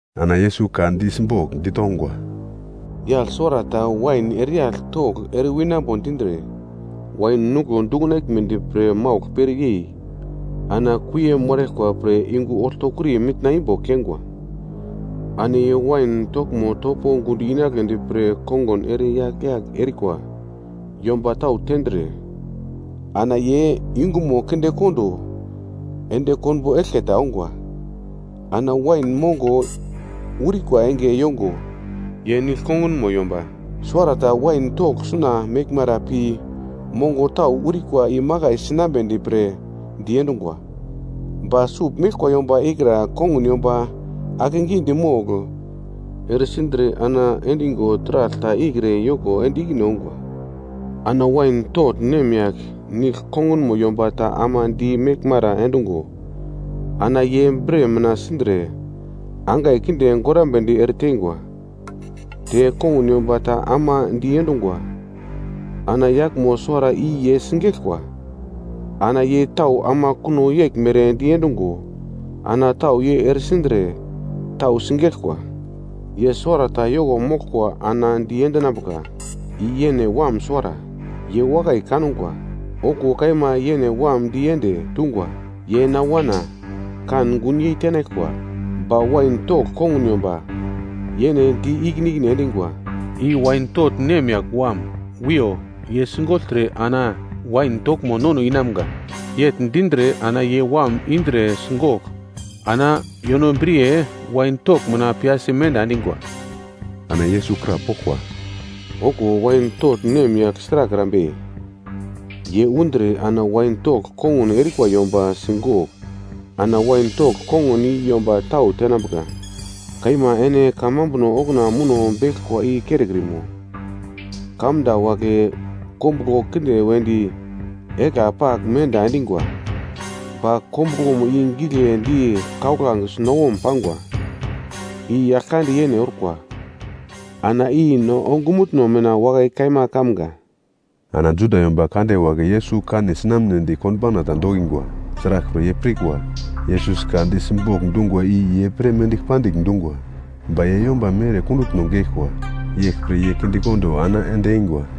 Ana Yesus ka di simbogl ditongwa, “Yagl suwarata wain ereyagl togl ere winambo dindre, wain nuglo dukunaglmedi pre maugl pere yei ana kuie moraglkwa pre yungu oltokuri mitna imbo keingwa. Ana ye wain toglmo topo gundo inagledi pre kongun ere yagl-yagl erikwa yomba tau tendre, ana ye yungumo kindekondo ende konbo eglke ta ongwa. Ana wain mongo urikwa enge yongo ye nigl kongunmo yomba suwarata wain togl sugl meglmara pi mongo tau urikwa imakai sinambedi pre diendungwa. Ba sugl meglkwa yomba ikra kongun yomba akegidi mogl, ere sindre ana endingo taragl ta ikre yoko ende ikine ongwa. Ana wain togl nemyagl nigl kongunmo yomba ta ama di meglmara endungo, ana ye bre mina sindre angai kinde gorambedi ere teingwa. Te kongun yomba ta ama diendungwa. Ana yaglmo suwara i ye sigeglkwa. Ana ye tau ama kuno yeglmere diendungo, ana tau ye ere sindre, tau sigeglkwa. “Ye suwarata yoko moglkwa ana diendinambuka, i yene wam suwara; ye wakai kangwa. Okuwo kaima yene wam di ende, dungwa, ‘Ye na wana, kan gunyei tenaglkwa.’ “Ba wain togl kongun yomba yene di ikine ikine endingwa, ‘I wain togl nemyagl wam. Wiyo, ye sigogltre ana wain toglmo nono inamga.’ Yegl dindre ana ye wam indre sigogl ana yonobriye wain togl mina piyasi menda endingwa.” Ana Yesus krapoglkwa, “Okuwo wain togl nemyagl sragl erambe? Ye undre ana wain togl kongun erikwa yomba sigogl, ana wain togl kongun i yomba tau tenambuka. Kaima ene kamambuno okuna muno beglkwa i kerekrimo? “‘Kamda wagle kombuglo kinde wedi egla pagl menda endingwa, ba kombuglomo i giglendi kauglange sunawom pangwa. I Yaglkande yene orkwa, ana i no ongumutno mina wakai kaima kamga.’” Ana Juda yomba kande wagle Yesus kane sinamnedi konbauna ta dokingwa. Sraglpre ye pirkwa, Yesus ka di simbogl dungwa i ye pre mendigl pandigl dungwa. Ba ye yomba mere kundutno geglkwa. Yeglpre ye kindekondo ana ende eingwa.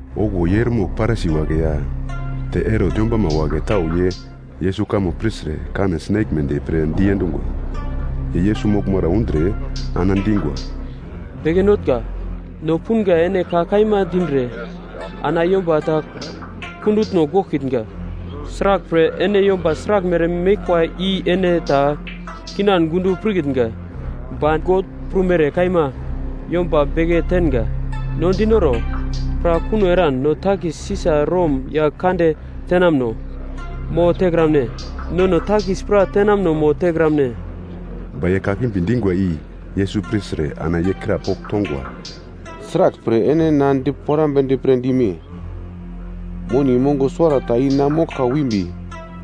Okuwo ye eremogl Parisi wagle ya te Herot yombama wagle tau ye Yesus kamo pirtre kane sinaglmedi pre diendungwa. Ye Yesus moglmara undre ana dingwa, “Beke Notnga, no punga ene ka kaima dindre ana yomba ta kundutno goglkitnga. Sraglpre, ene yomba sraglmere meglkwa i ene ta kinan gundo pirkitnga. Ba God prumere kaima yomba beke tenga. No dinoro, pra kuno eran no takis Sisa Rom yagl kande tenamuno mo tekramne? Nono takis pra tenamuno mo tekramne?” Ba ye kakimbi dingwa i Yesus pirtre ana ye krapogl tongwa, “Sraglpre ene na diporamnedi pre dime? Moni mongo suwarata i na moglka wimbi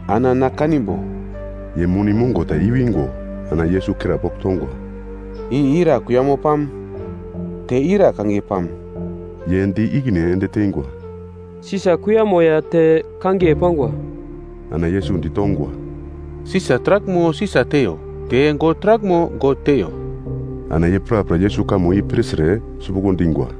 ana na kanimbo.” Ye moni mongo ta i-wingo ana Yesus krapogl tongwa, “I ira kuiyamo pam? Te ira kangiye pam?” Ye di ikine ende teingwa, “Sisa kuiyamo ya te kangiye pangwa.” Ana Yesus ditongwa, “Sisa taraglmo Sisa teiyo, te God taraglmo God teiyo.” Ana ye prapra Yesus kamo i pirtre sipuglo dingwa.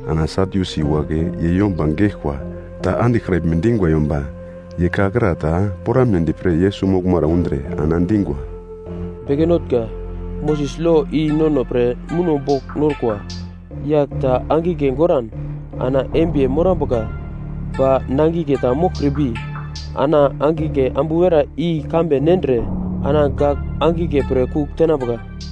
Ana Sadyusi wagle ye yomba geglkwa ta andiglkraglme dingwa yomba, ye ka kra ta poramnedi pre Yesus moglmara undre ana dingwa, “Beke Notnga, Moses lo i nono pre muno bogl norkwa, yagl ta angigle goran ana embiye morambuka, ba nangigle ta moglkrimbi, ana angigle ambu werai i kambe nendre ana gak angigle pre kugl tenambuka.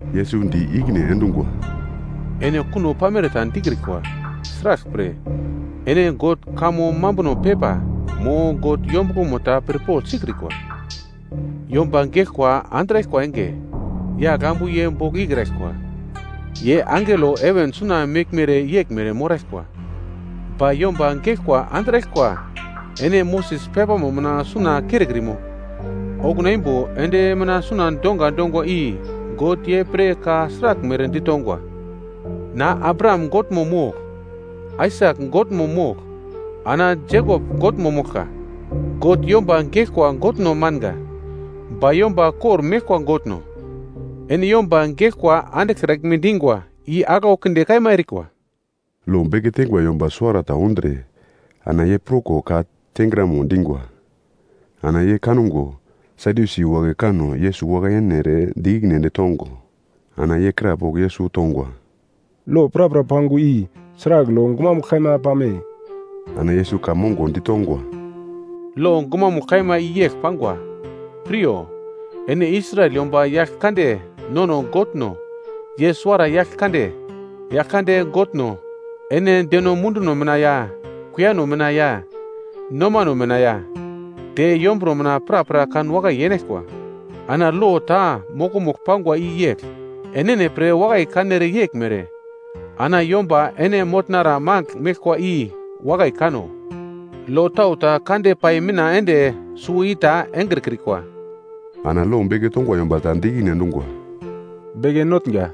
Yesus di ikine endungwa, “Ene kuno pamere ta dikrikwa. Sraglpre ene God kamo mambuno pepa, mo God yombuglomo ta pirpogl sikrikwa. Yomba geglkwa andraglkwa enge, yagl ambu ye bogl ikraglkwa. Ye angelo heven suna meglmere yeglmere moraglkwa. Ba yomba geglkwa andraglkwa ene Moses pepamo mina suna kerekrimo? Okuna imbo endi mina suna donga dongwa i God ye pre ka sraglmere ditongwa, ‘Na Abraham Godmo mogl, Aisak Godmo mogl, ana Jekop Godmo moglka.’ God yomba geglkwa Godno manga, ba yomba kormeglkwa Godno. Ene yomba geglkwa andiglkraglme dingwa i aglau kinde kaima erikwa.” Lo beke teingwa yomba suwarata undre ana ye pruko ka tengramo dingwa. Ana ye kango Sadyusi wagle kanno Yesus wakai yene ere di ikine ende tongo, ana ye krapogl Yesus tongwa, “Lo prapra pangwa i sragl lo gumamugl kaima pame?” Ana Yesus ka mongo ditongwa, “Lo gumamugl kaima i yegl pangwa, ‘Piryo, ene Israel yomba, Yaglkande nono Godno, ye suwara Yaglkande. Yaglkande Godno, ene deno munduno mina ya, kuiyano mina ya, nomano mina ya, te yomburo mina prapra kanwakai yenaglkwa.’ Ana lo ta mokomugl pangwa i yegl, ‘Enene pre wakai kanere yeglmere, ana yomba ene motnara magl meglkwa i wakai kano.’ Lo tau ta kande pai mina ende suwo i ta engrekrikwa.” Ana lo beke tongwa yomba ta di ikine endungwa, “Beke Notnga,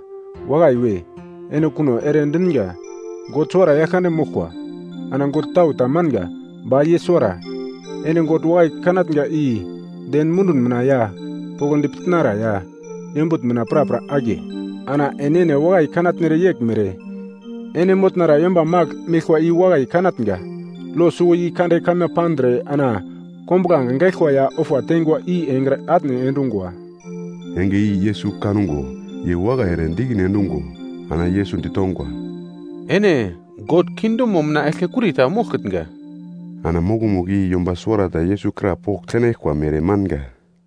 wakai we, ene kuno ere dinga. God suwara Yaglkande moglkwa. Ana god tau ta manga, ba ye suwara. Ene God wakai kanatnga i den mundun mina ya, poglodi pitnara ya, yombutn mina prapra akiye, ana enene wakai kanatnere yeglmere, ene motnara yomba magl meglkwa i wakai kanatnga. Lo suwo i kande kaima pandre ana kombuglange gaglkwa ya ofa teingwa i engre atne endungwa.” Enge i Yesus kango ye wakai ere di ikine endungo ana Yesus ditongwa, “Ene God kingdomo mina eglkekuri ta moglkitnga.” Ana mokomugl i yomba suwarata Yesus krapogl tenaglkwa mere manga.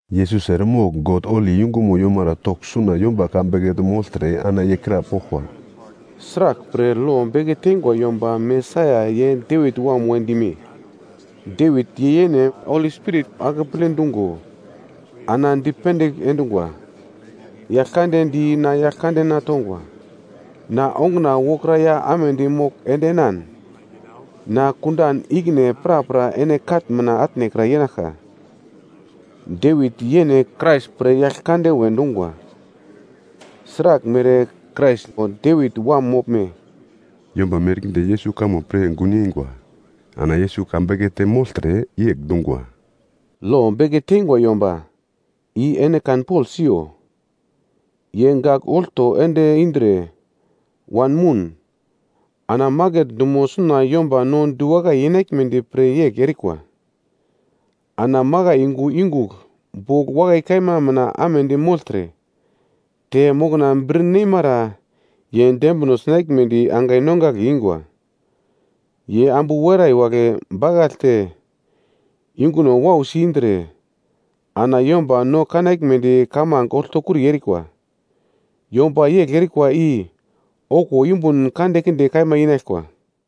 Yesus eremogl God holi yungumo yomara togl suna yomba ka bekete mogltre ana ye krapoglkwa, “Sraglpre lo beke teingwa yomba Mesaia ye Devit wam we dime? Devit ye yene Holi Spirit akeple dungo ana dipendigl endungwa, “‘Yaglkande di na Yaglkandena tongwa, “Na onguna wokra ya amedi mogl endenan, na kundan ikine prapra ene katn mina atnekra yenaglka.” ’ Devit yene Krais pre ‘Yaglkande’ we dungwa. Sraglmere Krais, Devit wam moglme?” Yomba merkinde Yesus kamo pir gun yeingwa. Ana Yesus ka bekete mogltre yegl dungwa, “Lo beke teingwa yomba i ene kanpogl siyo, ye gagl olto ende indre wanmoun, ana maket dumo suna yomba no diwakai yenaglmedi pre yegl erikwa. Ana makai yungu yungugl bogl wakai kaima mina amedi mogltre, te mokna bir nemara ye dembino sinaglmedi angai nongagle ingwa. Ye ambu werai wagle bakaglte yunguno wausi indre ana yomba no kanaglmedi kamange oltokuri erikwa. Yomba yegl erikwa i okuwo yumbun kandekinde kaima inaglkwa.”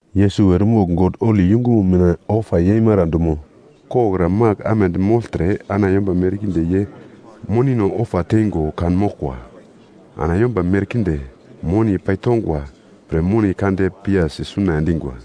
Yesus eremogl God holi yungumo mina ofa yeimara dumo koglokra magl amedi mogltre ana yomba merkinde ye monino ofa teingo kanmoglkwa. Ana yomba merkinde moni paitongwa pre moni kande piyasi suna endingwa.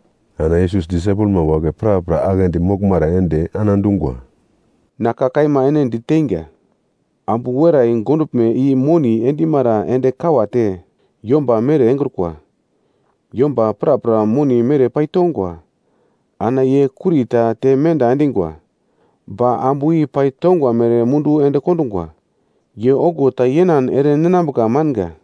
Ana Yesus disaipelma wagle prapra aglendi moglmara ende ana dungwa, “Na ka kaima ene diteinga, ambu werai gonduglme i moni endemara ende kawate yomba mere engrukwa. Yomba prapra moni mere paitongwa, ana ye kuri ta te menda endingwa, ba ambu i paitongwa mere mundu ende kondungwa. Ye okuwo ta yenan ere ninambuka manga.”